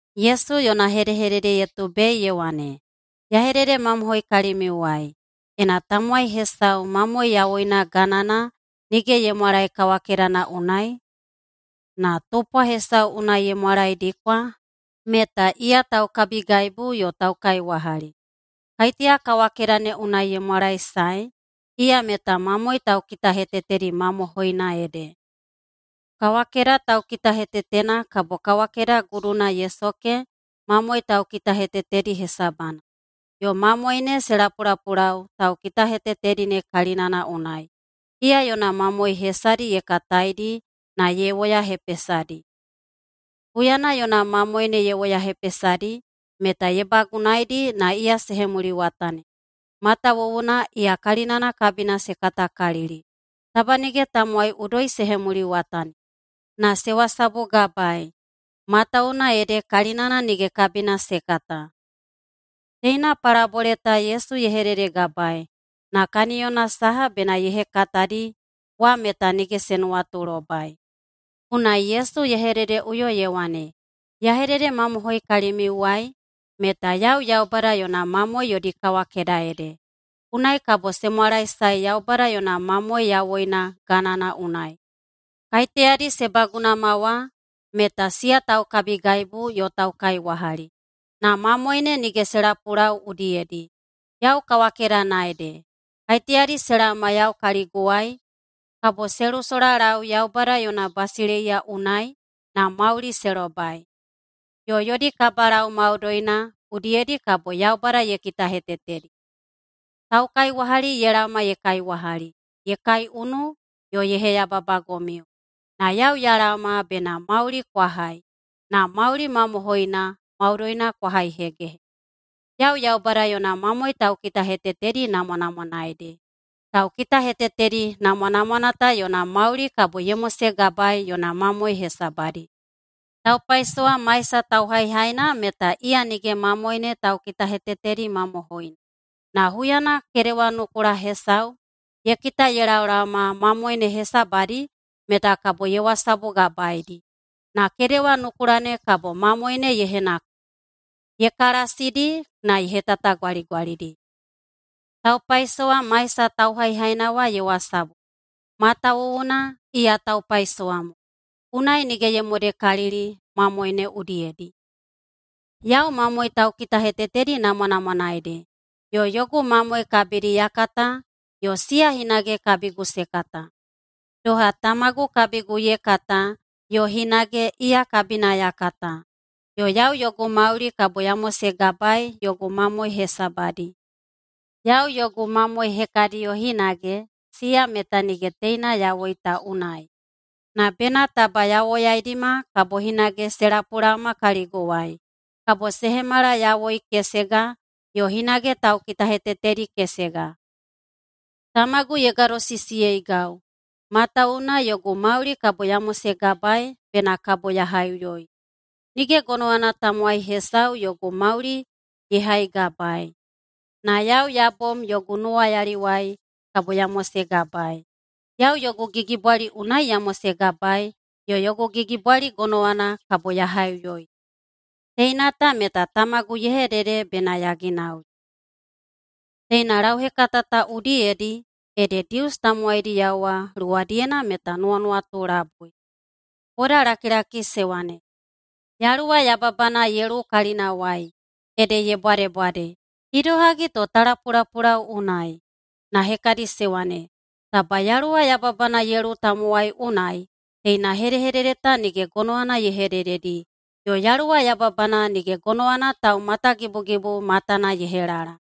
Yesu yona hedehedede ye tubei ye wane, “Ya hededemamohoi kalimiuwai: Ena tamowai hesau mamoe yawoina ganana nige ye mwalae kawakedana unai, na tupwa hesau unai ye mwalaedikwa, meta iya taukabigaibu yo taukaiwahali. Kaiteya kawakeda ne unai ye mwalaesae iya meta mamoe taukitahetetedi mamohoina ede. Kawakeda taukitahetetena kabo kawakeda guduna ye soke mamoe taukitahetetedi hesabana, yo mamoe ne se lapulapulau taukitahetetedi ne kalinana unai. Iya yona mamoe hesadi ye kataidi na ye woyahepesadi. Huyana yona mamoe ne ye woyahepesadi, meta ye bagunaedi na iya se hemuliwatani, matawuwuna iya kalinana kabina se katakalili. Taba nige tamowai udoi se hemuliwatani, na se wasabugabaei, matawuwuna ede kalinana nige kabina se kata.” Teina palabole ta Yesu ye hededegabaei, na kaniyona saha bena ye hekatadi wa meta nige se nuwatulobai. Unai Yesu ye hededeꞌuyo ye wane, “Ya hededemamohoi kalimiuwai meta yau Yaubada yona mamoe yodi kawakeda ede, unai kabo se mwalaesae Yaubada yona mamoe yawoina ganana unai. Kaiteyadi se bagunama wa meta siya taukabigaibu yo taukaiwahali, na mamoe ne nige se lapulau udiyedi. Yau kawakedana ede. Kaiteyadi se laoma yau kaliguwai kabo se lusolalau Yaubada yona basileiya unai na mauli se lobai. Yo yodi kabalau maudoina udiyedi kabo Yaubada ye kitahetetedi. Taukaiwahali ye laoma ye kaiwahali, ye kaiunu yo ye heyababagomiu, na yau ya laoma bena mauli kwa hai na mauli mamohoina maudoina kwa haihegehe. Yau Yaubada yona mamoe taukitahetetedi namwanamwana ede. Taukitahetetedi namwanamwana ta yona mauli kabo ye mosegabaei yona mamoe hesabadi. Taupaisowa maisa tauhaihaina meta iya nige mamoe ne taukitahetetedi mamohoina, na huyana kedewanukula hesau ye kita ye laoma mamoe ne hesabadi meta kabo ye wasabugabaedi. Na kedewanukula ne kabo mamoe ne ye henakudi, ye kalasidi na ye hetatagwaligwalidi. Taupaisowa maisa tauhaihaina wa ye wasabu, matawuwuna iya taupaisowa mo, unai nige ye modekalili mamoe ne udiyedi. Yau mamoe taukitahetetedi namwanamwana ede, yo yogu mamoe kabidi ya kata yo siya hinage kabigu se kata, doha Tamagu kabigu ye kata yo hinage iya kabina ya kata. Yo yau yogu mauli kabo ya mosegabaei yogu mamoe hesabadi. Yau yogu mamoe hekadiyo hinage, siya meta nige teina yawoi ta unai, na bena taba ya woyaidima kabo hinage se lapulaoma kaliguwai. Kabo se hemala yawoi kesega yo hinage taukitahetetedi kesega. Tamagu ye gadosisiyeigau, matawuwuna yogu mauli kabo ya mosegabaei bena kabo ya haiꞌuyoi. Nige gonowana tamowai hesau yogu mauli ye haigabaei, na yau ya bom yogu nuwayaliwai kabo ya mosegabaei. Yau yogu gigibwali unai ya mosegabaei yo yogu gigibwali gonowana kabo ya haiꞌuyoi. Teina ta meta Tamagu ye hedede bena ya ginauli.” Teina lauhekata ta udiyedi ede Dius tamowaidiyao wa luwadiyena meta nuwanuwatu labui. Bodalakilaki se wane, “Yaluwa yababana ye luwu kalinawai, ede ye bwadebwade. Idohagi to ta lapulapulau unai?” Na hekadi se wane, “Taba yaluwa yababana ye luwu tamowai unai, teina hedehedede ta nige gonowana ye hedededi. Yo yaluwa yababana nige gonowana taumatagibugibu matana ye helala.”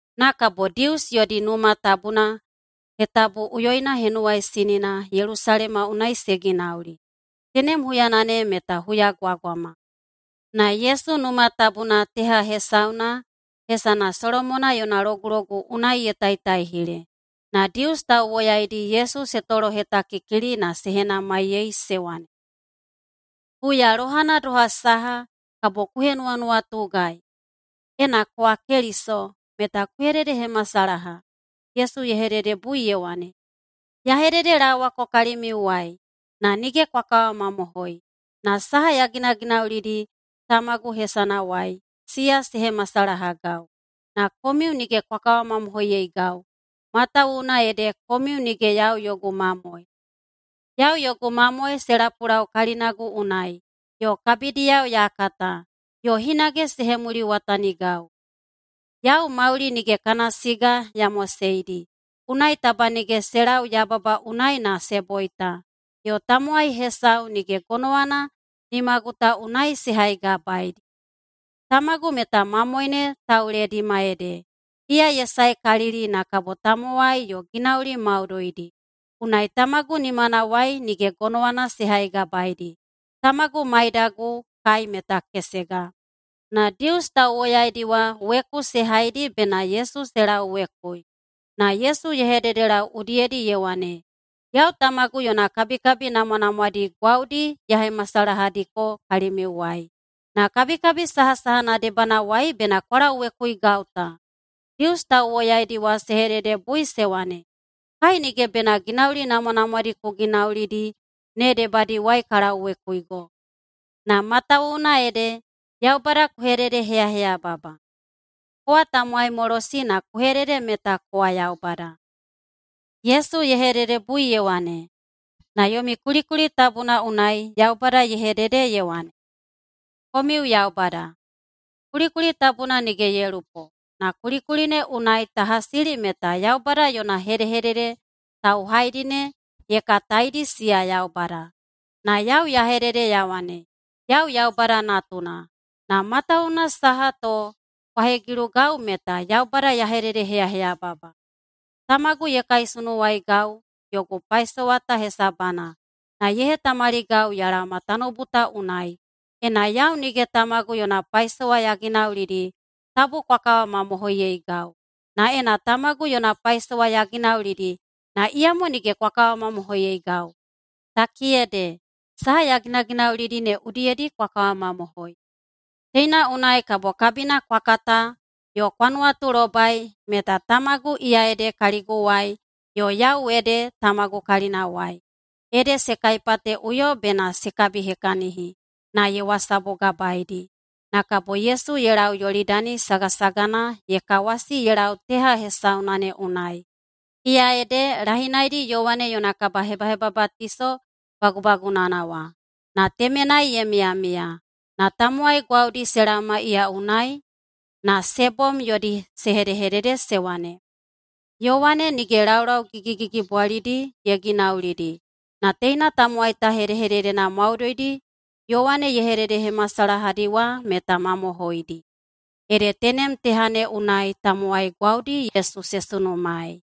Na kabo Dius yodi Numa Tabuna Hetabuꞌuyoina Henuwaisinina Yelusalema unai se ginauli. Tenem huyana ne meta huyagwagwama. Na Yesu Numa Tabuna teha hesauna hesana Solomona yona Logulogu unai ye taitaihile. Na Dius tauwoyaidi Yesu se tolohetakikili na se henamaiyei se wane, “Huya lohana doha saha kabo ku henuwanuwatugai? Ena kowa Keliso, meta ku hededehemasalaha.” Yesu ye hededebui ye wane, “Ya hededelaowako kalimiuwai, na nige kwa kawamamohoi. Na saha ya ginaginaulidi tamagu hesanawai, siya se hemasalahagau. Na komiu nige kwa kawamamohoiyeigau, matawuwuna ede komiu nige yau yogu mamoe. Yau yogu mamoe se lapulau kalinagu unai, yo kabidiyao ya kata, yo hinage se hemuliwatanigau. Yau mauli nige kana siga ya moseidi, unai taba nige se lau yababa unai na se boita, yo tamowai hesau nige gonowana nimagu ta unai se haigabaedi. Tamagu meta mamoe ne tauledima ede, iya ye saekalili na kabo tamowai yo ginauli maudoidi. Unai Tamagu nimanawai nige gonowana se haigabaedi. Tamagu maidagu kai meta kesega.” Na Dius tauwoyaidi wa weku se haidi bena Yesu se lauwekui. Na Yesu ye hededelau udiyedi ye wane, “Yau Tamagu yona kabikabi namwanamwadi gwaudi ya hemasalahadiko kalimiuwai. Na kabikabi sahasahana debanawai bena kwa lauwekuigau ta?” Dius tauwoyaidi wa se hededebui se wane, “Kai nige bena ginauli namwanamwadi ku ginaulidi ne debadiwai ka lauwekuigo, na matawuwuna ede Yaubada ku hededeheyaheyababa. Kowa tamowaimolosi na ku hedede meta kowa Yaubada.” Yesu ye hededebui ye wane, “Na yomi kulikuli tabuna unai Yaubada ye hedede ye wane, ‘Komiu yaubada.’ Kulikuli tabuna nige ye lupo, na kulikuli ne unai ta hasili meta Yaubada yona hedehedede tauhaidi ne ye kataidi siya yaubada. Na yau ya hedede ya wane, yau Yaubada Natuna. Na matawuwuna saha to kwa hegilugau meta Yaubada ya hededeheyaheyababa? Tamagu ye kaisunuwaigau [yogu paisowa ta hesabana] na ye hetamaligau ya laoma tanoubu ta unai. Ena yau nige Tamagu yona paisowa ya ginaulidi, tabu kwa kawamamohoiyeigau. Na ena Tamagu yona paisowa ya ginaulidi, na iyamo nige kwa kawamamohoiyeigau, takiyede saha ya ginaginaulidi ne udiyedi kwa kawamamohoi. Teina unai kabo kabina kwa kata yo kwa nuwatulobai meta Tamagu iya ede kaliguwai yo yau ede Tamagu kalinawai.” Ede se kaipateꞌuyo bena se kabihekahini, na ye wasabugabaedi. Na kabo Yesu ye lau Yolidani sagasagana ye kawasi ye lau teha hesauna ne unai, iya ede lahinaidi Yowane yona kabahebahebabatiso bagubagunana wa, na temenai ye miyamiya. Na tamowai gwaudi se laoma iya unai. Na se bom yodi se hedehedede se wane, “Yowane nige laulau gigigigibwalidi ye ginaulidi, na teina tamowai ta hedehededena maudoidi Yowane ye hededehemasalahadi wa meta mamohoidi.” Ede tenem teha ne unai tamowai gwaudi Yesu se sunumaei.